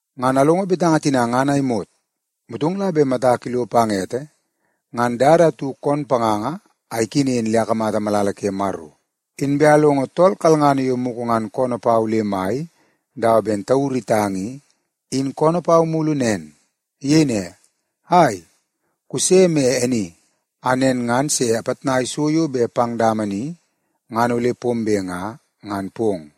Ngan alongo betanga tina ngan a imot, motong la bet matak ilo pang ete ngan dada atu koon panganga a ikenen le akamata malala ke Maro. Inbe alongo tool kalngana yo mugu ngan koonoo pau le mai dawa ben tauru itang i, in koonoo pau mulu nen. Iyei ne, “Ai, kuse me e ni a nen ngan se apitnai so yo bet pang dama ni ngan ole pombe nga, ngan pong.”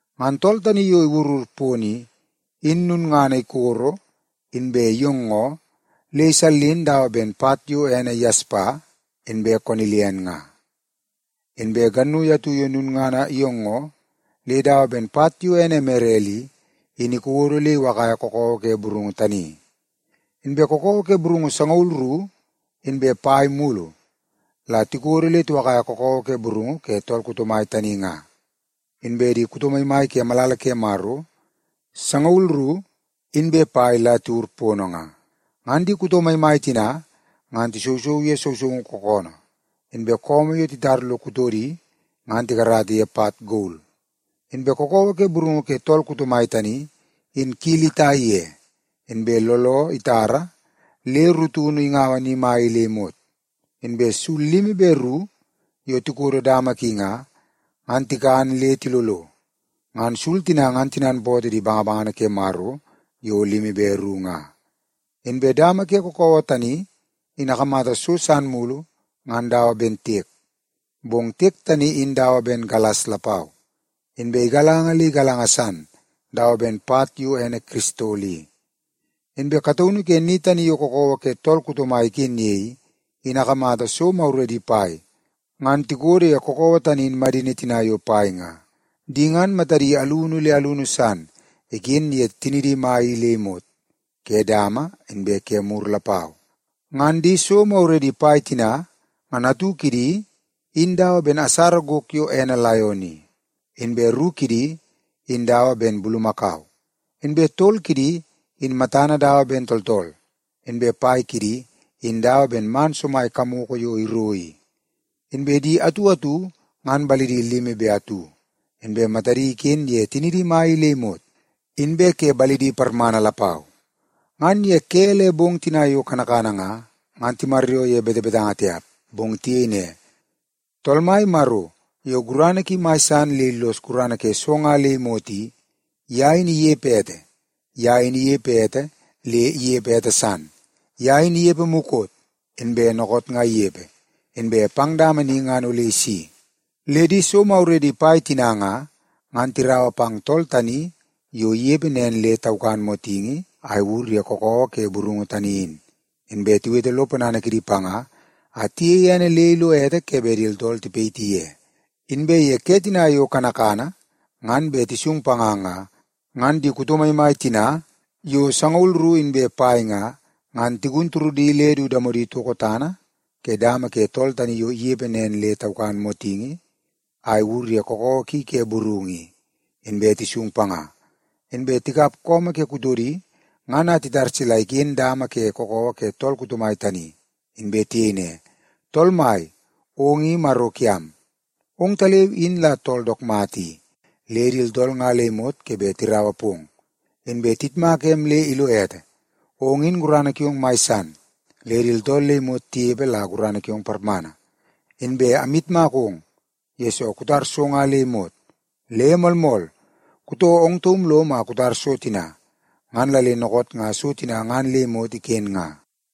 Ngan tool tani yo iwurur pono i, in lulngana ikoro inbe iyoongoo le isallin dawa ben pat yo ene yaspa inbe konilian nga. Inbe gannui atu yo lulngana iyoongoo le dawa ben pat yo ene emerel i, in ikodo le iwakaia kakawa ke burungu tani. Inbe kakawa ke burungu sangaul ru inbe pai mulu la tikodo le tiwakaia kakawa ke burungu ke tool kuto mai tani nga, inbe di kuto maimai ke malala ke Maro sangaul ru inbe pai la tiwur pono nga. Ngan di kuto maimai tina ngan tisousou ye sousoungu kookoonoo, inbe su yo titar lo kutodi ngan tikarata ye pat gol. Inbe kakawa ke burungu ke tool kuto mai tani, in kili itai ye, inbe looloo itara le rutunu ingaua ni mai i le imot. Inbe sul limi be ru yo tikodo dama ki nga, ngan tikan le tilolo. Ngan sul tina ngan tinanpootoo di bangabangana ke Maro yo limi be ru nga. Inbe dama ke kakawa tani in akamata so san mulu ngan dawa ben tiek, bong tiek tani in dawa ben galas lapau. Inbe igalanga le igalanga san dawa ben pat yo ene kiristol i. Inbe kataunu ke ni tani yo kakawa ke tool kuto mai iken ye i, in akamata so maguredi pai ngan tikodo ye kakawa tani in madini tina yo pai nga. Di ngan matadi alunu le alunu san iken ye tinidi mai i le imot ke dama inbe ke mur lapau. Ngan di so maguredi pai tina, ngan atu kidi in dawa ben asara gok yo ene laion i, inbe ru kidi in dawa ben bulumakau, inbe tol kidi in matana dawa ben tooltool, inbe pai kidi in dawa ben man somai kamoko yo iro i. Inbe di atu atu ngan balidi limi be atu, inbe matadi iken ye tinidi mai i le imot inbe ke balidi parmana lapau. Ngan ye ke le bong tina yo kanakana nga, ngan timaryoo ye betebetanga tiap, bong tiyei ne, “Tool Mai Maro yo gurana ki mai san le illos gurana ke so nga le imot i, ye in inepe ete. Ye in inepe ete le inepe ete san. Ye in inepe mukot, inbe dookoot nga inepe, inbe pang dama ni ngan ole isi.” Le di so maguredi pai tina nga, ngan tiraua pang tool tani yo inepe nen le taukan motingi a iwur ye kakawa ke burungu tani in, inbe tiwete lo ponana kidi panga a tiyeie ene le ilo ete ke bet di tooltool tipayiti ye. Inbe ye ke tina yo kanakana ngan bet tisung panga nga, ngan di kuto maimai tina yo sangaul ru inbe pai nga, ngan tigun turudi le du damodi itoko tana ke dama ke tool tani yo inepe nen le taukan motingi a iwur ye kakawa ki ke burungu i, inbe tisung panga. Inbe tikap su ke kutodi ngan a titar sila iken dama ke kakawa ke tool kuto mai tani. Inbe tiyei ne, “Tool Mai, ong i Maro kiam. Ongtaleu in la tool dook mata i, le di tooltool nga le imot ke bet tiraua pong, inbe tiyitmaka em le ilo ete. Ong in gurana kiong mai san, le di tooltool le imot tinepe la gurana kiong parmana. Inbe amyitmakong, yesoo kutar so nga le imot. Le moolmool, kutoo ong taum lom a kutar so tina, ngan la le dookoot nga so tina ngan le imot iken nga.”